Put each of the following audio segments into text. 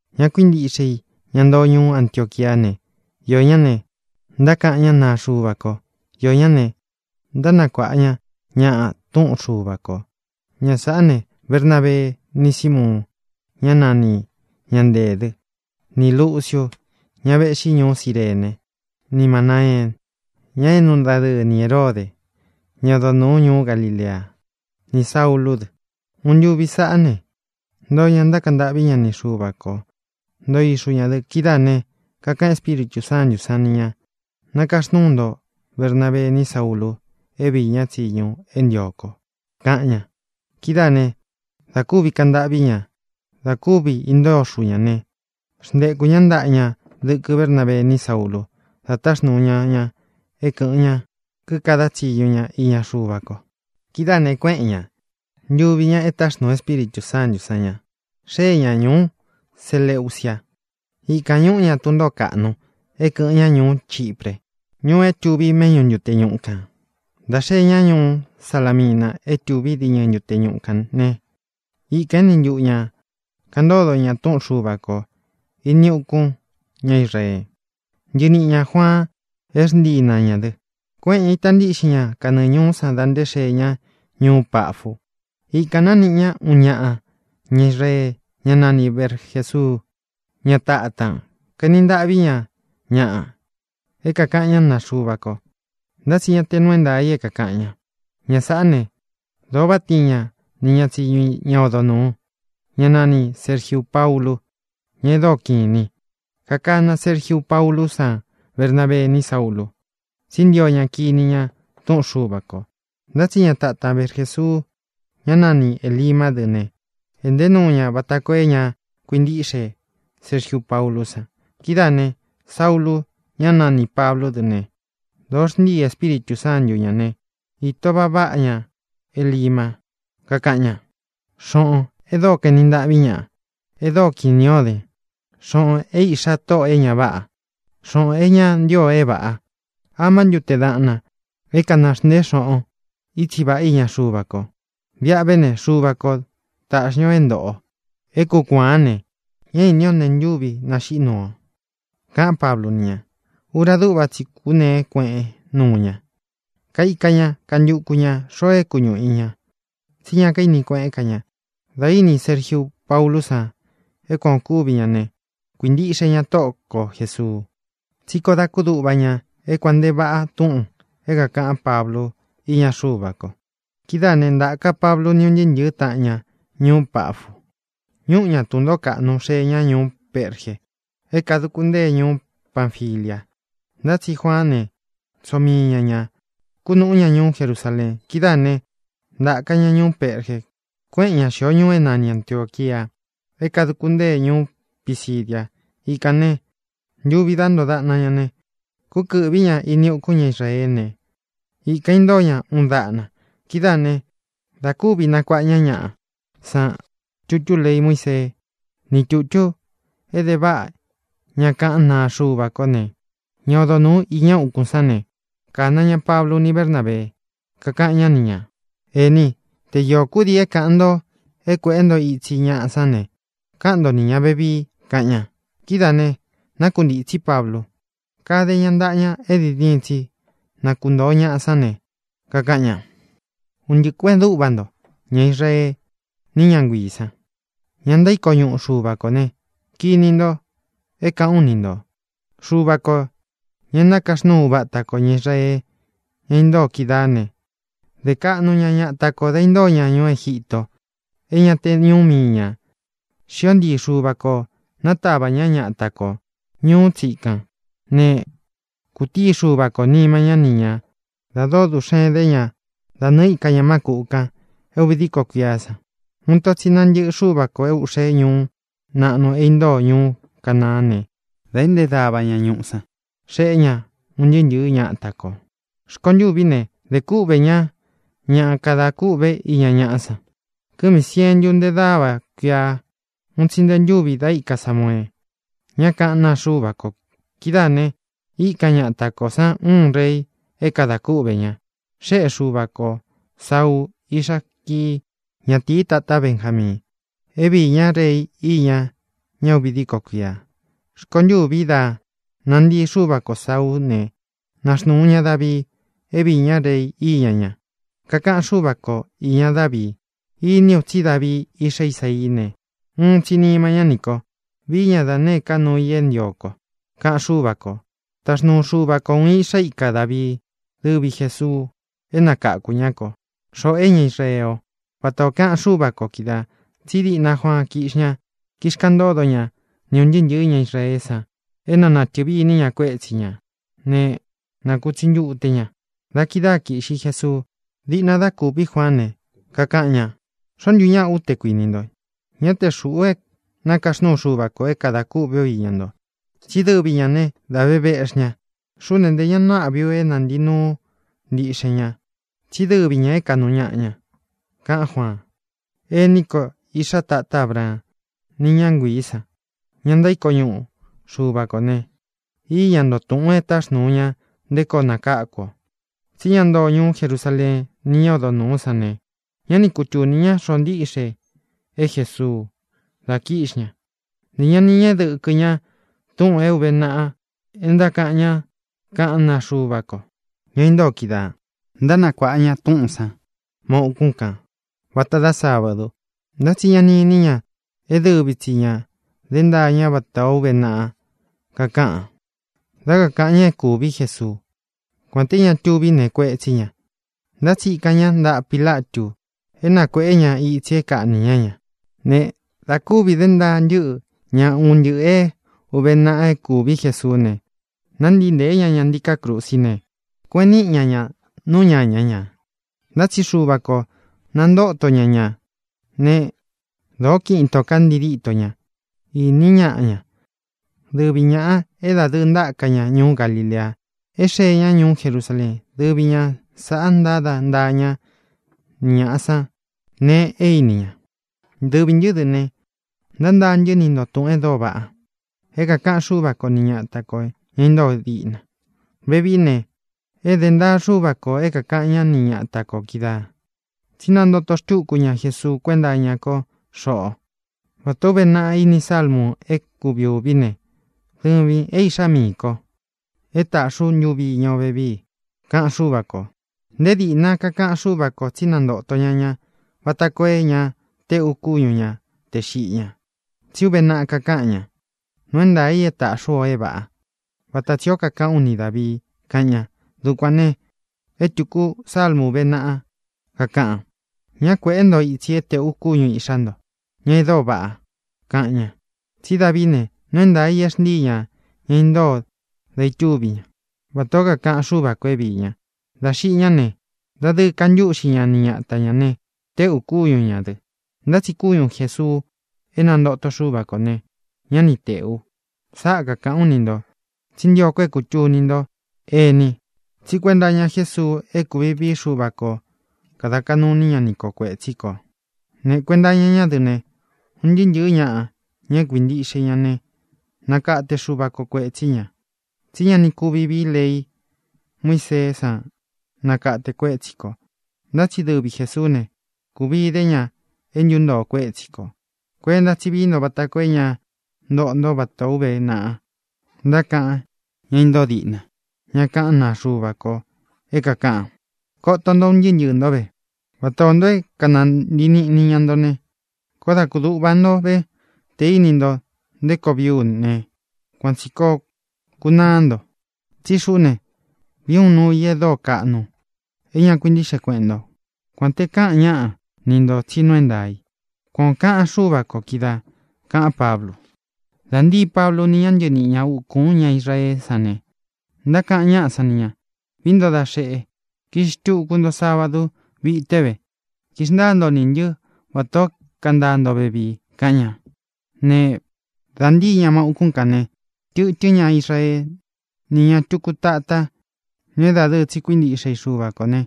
Ña kuíntiꞌxe i, ña ntoo ñuú Antioquia ne, iō ñá ne, ntákaꞌan ñá naa Xuva ko; iō ñá ne, ntánakuāꞌa ña ñaꞌa túꞌun Xuva kō. Ña sāꞌá ne: Bernabee, ni Símuun, ñá nani Ña Nteē dɨ́; ni Lūciu, ña véꞌxi ñuú Cirene; ni Manāeen, ña éꞌnu dadɨɨ ni Hērode, ñá odo nūu ñuú Galilea; nī Saúlū dɨ. Uun ntuvi sāꞌá ne, ntoo ña, ntákaꞌan ntâꞌví ña ni Xuva kō; ntoo ixu ñā dɨ. Kidáā né, kakaꞌan Espíritū Sántū san ni ña: —Nakaxnúu nto Bernabee ni Saúlū é viī ñá tsiñu é ntio ko —kaꞌan ña. Kidáā né, dā kúvi kaꞌan ntâꞌví ña, dā kúvi intóo ixu ñā né, xntekū ñá ntaꞌa ña dɨkɨ Bernábee ni Saúlū, da táxnūu ña ña é kɨ̄ꞌɨn ña, kikadá tsiñu ña iña Xuva ko. Kidáā ne, kuéꞌen ñā, ntuvi ña, e táxnūu Espíritū Sántū sán ña, xée ña ñūú Seleucia. Ikān ñúꞌu ña tun ntōó kaꞌnu é kɨ̄ꞌɨn ñá ñuú Chipre, ñuu é tuví méꞌñu ntute ñuꞌu kān. Dā xee ñá ñuú Salamina é tuví diñɨ ntute ñuꞌu kān né, ikān éni ntuꞌu ñā kaꞌan ntódo ña túꞌun Xuva kō ini ukún ña Israee. Ntɨɨ niꞌi ñā Juaan, é xntii na ñā dɨ. Kuéꞌen ñā, ita ntíꞌxin ña kanɨɨ ñūú san dá ntē xee ñá ñuú Pafu. Ikān nániꞌi ñá uun ñaꞌa ña Israee, ñá nani Barjēsuu, ñá tatan. Kaeni ntaꞌví ña ñaꞌa é kākaꞌan ñá naa Xuva ko; ntá tsi ñá tē nuu é ntaā i é kākaꞌan ña. Ña sāꞌá ne, dōo váꞌa tiin ña ni ña tsiñu i ña odo nūu, ñá nanī Sergiu Paulu, ña e dóo kiꞌin inī i. Kakana Sergiu Paulú san Bernabee ni Saúlū, tsí ntio ña kini ña túꞌun Xuva kō. Ntá tsi ña tatan Barjesuu, ñá nani Ēlima dɨ́ ne, ēꞌnté nuu ña vata koo é ña kuintíꞌxe Sergiu Paulú san. Kidáā ne, Saúlū, ñá nanī Pablú dɨ ne, dōo xntíi Espíritū Sántu ñā né, īto vaꞌa váꞌa ña Elima, kakaꞌan ña: —Xōꞌon e dóo kaenin ntaꞌvín ñaꞌa, e dóo kini ó den, xōꞌon é iꞌxá Tóꞌō é ña váꞌa, xōꞌon é ña ntío o é vāꞌá, ¿amá ntu teén daꞌnan é kanāxnteén xoꞌon itsi vāꞌá iña Xuva ko? Viꞌa ve ne, Xuva ko tāꞌxi ña o é ntōꞌo o, é kūkuaan ne, ñá īní o nēe ntúvi naxiꞌí nuu o —kaꞌán Pablu ni ña. Ura dúꞌva tsi i kúneé kueꞌen nuu ña. Kaika ña, kantuku ñā xoo é kuñuꞌu i ña, tsí ña kaíni kueꞌén ka ña. Dā íni Sergiu Paulú san é kuan ō kúvi ña ne, kuīntiꞌxe ña Tóꞌo ko Jēsuu, tsí koó dā kúduꞌva ña é kuān nte váꞌa túꞌūn é kākaꞌán Pablu iña Xuva ko. Kidáā né, ntāka Pablu ni ún ntɨɨ́ ntɨ̄ɨ́ taꞌan ña ñuú Pafu, ñúꞌu ña tun ntōó kaꞌnu, xée ña ñuú Perge, é kaduku ntee ñuú Panfilia; ntá tsi Juaán ne, tsoo mii ña ña, kunúꞌu ña ñuú Jerusaleen. Kidáā né, ntāka ña ñuú Perge, kueꞌen ña xio ñuu é nani Antiōquia, é kāduku ntee ñuú Pisidia. Ikān ne, ntuvi dá ntoo daꞌna ña ne, kúkɨ̄ꞌví ña ini ukún ña Israeé ne, ikān intóo ña uun daꞌna. Kidáā ne, da kúvi nakuaꞌa ñaꞌá san tutú lei Muísee ní tutú e de váꞌa ña kaꞌán naa Xuva ko ne, ña odo nūu iña úkūn sán ne, kāna ña Pablu ni Bernábee, kakaꞌan ñá ni ñā: —Ēní, te iō kúdii é kāꞌan nto é kuēꞌe nto itsi ñaꞌa sán ne, káꞌan nto ni ñā vevii —kaꞌan ña. Kidáā ne, nákuntītsí Pablu, káde ña ntaꞌa ña é diin diin tsi na kuntōo ñaꞌa sán ne, kakaꞌan ña: —Un ntɨꞌɨ kuēꞌen dúꞌva nto, ña Israee ni ña nguíī san, ña ntaíko ñuꞌu Xuva kō ne, kini nto é kāꞌán u ni ntō: Xuva kō, ña é nakaxnúu uva ata kō ña Israee, ña intóo kídaā né, de kaꞌnu ña ñata kō da intóo ña ñuú Egítō, é ña te ñuú mii ñā. Xío ntii Xuva kō nátavā ñá ñata ko ñūú tsikan. Ne, kutíi Xuva kō nima ñá ni ñā da dóo duꞌxen dé ña da nɨɨ̄ íka ña má kūꞌu kan é uvi díko kuiá san. Uun ito tsi nantɨ́ꞌɨ Xuva kō é ūꞌxe ñuu naꞌnu é intóo ñuú Canaán ne, dā eꞌnté dava ña ñuꞌu san, xéꞌe ña un ntɨɨ́ ntɨ̄ɨ́ ñata kō. ʼRkontûví ne, de kúꞌvē ñá ña kada kúꞌve iña ñaꞌa san kɨmi sientu nte dáva kuia, uun tsi nte ntúvi da íka Samuee, ñá kaꞌán naa Xuva ko. Kidáā ne, íkan ñata kō sán uun rei é kadā kúꞌvē ña. Xéꞌe Xuva ko Sāuu, iꞌxá Kii, ñatīí tatá Benjamiin, é viī ñá rei íña ña uvi díko kuia. Rkontûví da nantii Xuva ko Sāuú ne, naxnūu ña Davii é viī ñá rei iña ña. Kakaꞌan Xúva ko īña Dávii: “Iní u tsí Davii, iꞌxá Isaií ne, uun tsi nima ñá nī ko. Viī ñá da nēé ka nuu i é ntio ko”, kaꞌan Xúva kō. Taxnuu Xuva ko ūun iꞌxá ika Dāvií, dɨvi Jēsuu, é nakakū ñá ko, xoꞌō é ña Israee ó, vata ō kaꞌan Xúva kō kídaā. Tsí diꞌna Juaan kíꞌxi ña, kixkaꞌan ntódo ña ni ūn ntɨɨ́ ntɨ̄ɨ́ ña Israeé san é na nātɨvi iní ña kuétsi ñā ne, na kūtsi ntute ña. Da kidáa kīꞌxi Jesuu. Diꞌna da kuví Juaán ne, kakaꞌan ña: “¿Xoó ntu ñaꞌa u, té kuinī nto? Ñá te xūꞌú é nakaxnúu Xuva kō é kadā kûꞌvé u iña nto, tsí dɨvi ñā né, dā ve véꞌxi ña. Xuꞌú ne, ntē ña nuu áꞌvi u é nantīi ú ntiꞌxen ña, tsí dɨvi ñā é kāꞌnu ñaꞌa ña”, kaꞌán Juaan. ʼĒní ko, iꞌxá tatá Abraan, ni ñá nguiī san, ña ntaíko ñuꞌu Xuva kō ne: íña nto túꞌūn e táxnūu ña nté koo nakáku ō. Tsí ña ntoó ñuú Jerusaleen ni ñá odo nūú san ne, ñá ni kutūni ñá xoó ntiꞌxe é Jesuu dá kīꞌxi ña. Ntē ña ni ñéꞌe dɨkɨ ña túꞌūn é ūve naꞌa é ntákaꞌan ñá kaꞌán naa Xuva ko, ña intóo kídaā. Ntánakuāꞌa ña túꞌūn san ma ukún kān vata dá sábadu, ntá tsi ña ni ini ña é dɨvi tsi ña dé ntaā ñá vata ō uve naꞌa kakaꞌan, dá kaꞌan ña é kūví Jesuu. Kuān té ña tuví nēe kuetsí ña, ntá tsi ikan ña ntaꞌa Pīlatu é na kuēꞌé ña itsi é kāꞌní ña ña. Ne, dā kúvi dé ntaa ntɨ́ꞌɨ ña un ntɨꞌɨ̄ é ūve naꞌa é kūvi Jesuú ne, nántii ntēé ña ña ntiká krusí ne, kueꞌen níꞌi ña ña nú ñaña ñā. Ntá tsi Xuva kō nantóto ñá ña. Ne, dōó kiꞌin itō ká ntii díto ña. Íni ñaꞌa ña, dɨvi ñāꞌa é dadɨɨ ntáka ña ñuú Galilea é xee ñá ñuú Jerusaleen. Dɨvi ña sāꞌa ntáda ntaá ña ni ñāꞌa san nee e íni ña. ʼDɨvī ntɨ́ dɨ ne, ntántaa ntɨ́ ni ntō túꞌūn e dóo váꞌa é kākaꞌan Xúva ko ni ñata kō, ña intóo diꞌna. Vevií ne, é dē ntaa Xúva kō é kākaꞌan ñá ni ñata kō kídaā, tsí nantóto xtūku ñá Jesuu kuénta iña ko xoꞌo. Vata ō úve naꞌa ini sálmu é kuvi ūví ne: “Dɨvīn é iꞌxá miī ko. E táꞌxi ú ntuvi iña o vevii”, kaꞌan Xúva kō. Nté dīꞌna kakaꞌan Xúva kō tsí nantōto ña ña vata koo é ña teꞌu kúñu ña tē xiꞌi ña, tsí uve naꞌa kakáꞌan ña: “Nuu é ntaā i é tāꞌxi ú o é vāꞌá, vata tsi ō kaꞌán u ni Dāvii”, kaꞌan ña. Dukuān ne, é tūku sálmu úve naꞌa, kakaꞌan: “Ñá kuēꞌé nto itsi é tēꞌu kúñu īꞌxá nto, ña e dóo vaꞌa”, kaꞌan ña. Tsí Davií ne, nuu é ntaā i e xntíi ña ña intóo dá ītúvi ña, vatā ó kākaꞌan Xúva kō é viī ña. Dā xiꞌi ñá ne, dadɨɨ kantúꞌxi ña ni ñata ñā ne, téꞌū kúñu ñā dɨ. Ntá tsi kúñu Jēsuu é nantóto Xuva kō ne, ñá ni tēꞌu. Sáꞌa kākaꞌán u ni ntō, tsí ntio ko é kūtuni nto, ení, tsí kuenta iña Jésuu é kūvi vií Xuva kō kada kaꞌnu iní ña ni ko kuētsí kō. Ne, kuenta iña ñá dɨ ne, un ntɨɨ́ ntɨ̄ɨ́ ñaꞌa, ña é kuíntiꞌxe i ña ne, nakate Xuva ko kuetsi ñā. Tsí ña ni kúvi vīí lei Muíseé san nakate kuétsi kō; ntá tsi dɨvi Jēsuú ne, kūvi idé ña é ntuntoo kuétsi kō. Kuenta tsí vií nto vata koo é ña ntoꞌo nto vatā ó uve naꞌa ntákaꞌan ñá intóo diꞌna, ña kaꞌán naa Xuva ko, é kākaꞌan: Koto nto, un ntɨɨ́ ntɨɨ̄ ntó ve, vata ō nto é kanantii niꞌni ña nto ne, koó dā kúduꞌva nto vé te inī ntó nté koo vií u ne, kuan tsī koo kunaá nto. Tsí xuꞌú ne, vií u uun nuu i e dóo kaꞌnu é ña kuintíꞌxe kueꞌen nto, kuān te káꞌan ñáꞌa ni ntō tsí nuu é ntaā i. Kuan ō kaꞌan Xúva kō kídaā —kaꞌán Pablu. Dā ntíi Pablu ni ña ntɨɨ níꞌi ñā ukún ña Israeé san ne, ntákaꞌan ñáꞌa san ni ñā: —Vií nto da xeꞌe, kiꞌxí xtuku nto sábadu vité ve, kixntaa ntó nī ntɨ́ vatā ó kantaa ntó vevii —kaꞌan ña. Ne, dā ntíi ña ma ukún kān ne, tɨtɨ́n ña Israee ni ña túku tatá, ña é dadɨɨ tsi kuíntiꞌxe i Xuva kō ne,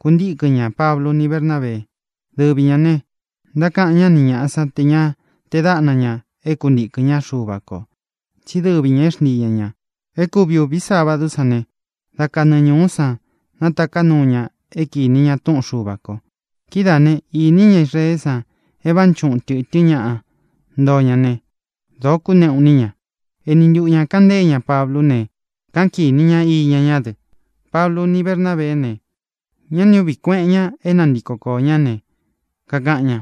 kuntíkɨn ñā Pablu ni Bernábee. Dɨvi ñā ne, ntákaꞌan ñá ni ñāꞌa san te ña tee dáꞌna ña é kuntīkɨn ñá Xuva kō, tsí dɨvi ñā é xntíi ña ña. É kuvi ūvi sabadú san ne, da kanɨɨ ñūú san nátaká nuu ña é kinī ñá túꞌun Xuva kō. Kidáā né, īní ña Israeé san e vánchuꞌun tɨ̄tɨ́n ñaꞌa ntoo ña ne, dōo kúneꞌu iní ña. Ēni ntuꞌu ña kaꞌan ntée ña Pablú ne, káꞌan kīni ña iña ñá dɨ. Pablu ni Bernábeé ne, ñá ni ūꞌví kueꞌen ña é nantiko koō ñá ne, kakaꞌan ña: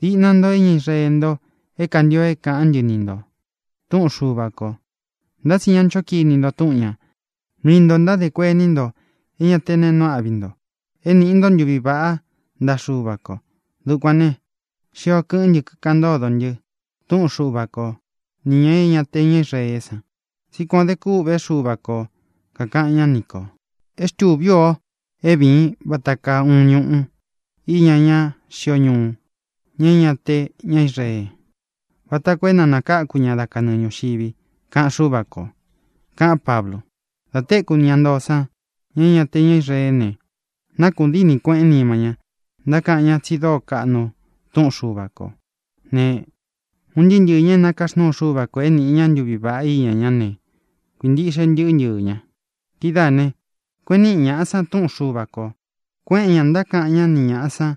—Diꞌna nto é ña Israee nto é kāntio é kāꞌán ntɨ ni ntō túꞌun Xuva kō, ntá tsi ña ncho kini nto túꞌun ñā. Mii ntō ntádē kuení nto é ña te neé nuu áꞌvi nto é nīꞌi nto ntuví vaꞌá ntaꞌa Xúva kō. Dukuān ne, xio kɨꞌɨ́n ntɨ, kikaꞌan ntódo ntɨ túꞌun Xuva ko nī ña é ña te ña Israeé san. Tsí kuān o dé kûꞌvé Xuva kō, kakaꞌan ñá ni kō: É xtūví u o é vīin vata kaa uun ñuꞌu íña ñá xio ñuu, ña é ña te ña Israee, vata koo é na nākáku ñaꞌa dá kanɨɨ ñūxivi, kaꞌan Xúva kō —kaꞌán Pablu. Dā téku ña ntoo san, ña é ña te ña Israeé ne, nákuꞌun díni kueꞌén nima ñá, ntákaꞌan ñá tsi dóo kaꞌnu túꞌun Xuva kō ne, un ntɨɨ́ ntɨɨ̄ ña é nakaxnúu Xuva kō é nīꞌi ña ntuví vaꞌá iña ñá ne, kuīntiꞌxe ntɨɨ́ ntɨɨ̄ ña. Kidáā ne, kueꞌen níꞌi ñaꞌa san túꞌun Xuva kō. Kuéꞌen ñā, ntákaꞌan ñá ni ñāꞌa san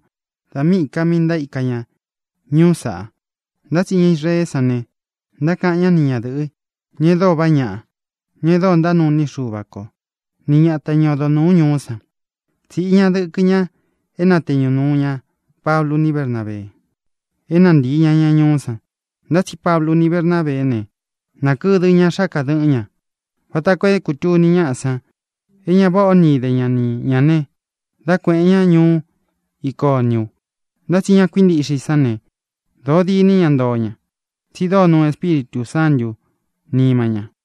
da míꞌī ka mí ntaíka ña ñuú saꞌa. Ntá tsi ña Israeé san ne, ntákaꞌan ñá ni ñadɨ̄ꞌɨ, ña e dóo vaꞌá ñaꞌa, ña e dóo ntánuu iní i Xuva ko, ni ñata, ña odo nūú ñuú san. Tsiꞌí ña dɨkɨ ña é natēñu nuu ña Pablu ni Bernábee, é nantīi ña ña ñuú san. Ntá tsi Pablu ni Bernábeé ne, nakɨdɨ ña xáka dɨꞌɨn ña vata koo é kūtuni ñáꞌa san é ña váꞌa o ni ide ña ni ñā ne, dá kueꞌēn ñá ñuú Iconiu. Ntá tsi ña kuíntiꞌxe i sán ne, dōo dîní ña ntoo ña, tsi dóo nuu Espíritū Sántū nima ña.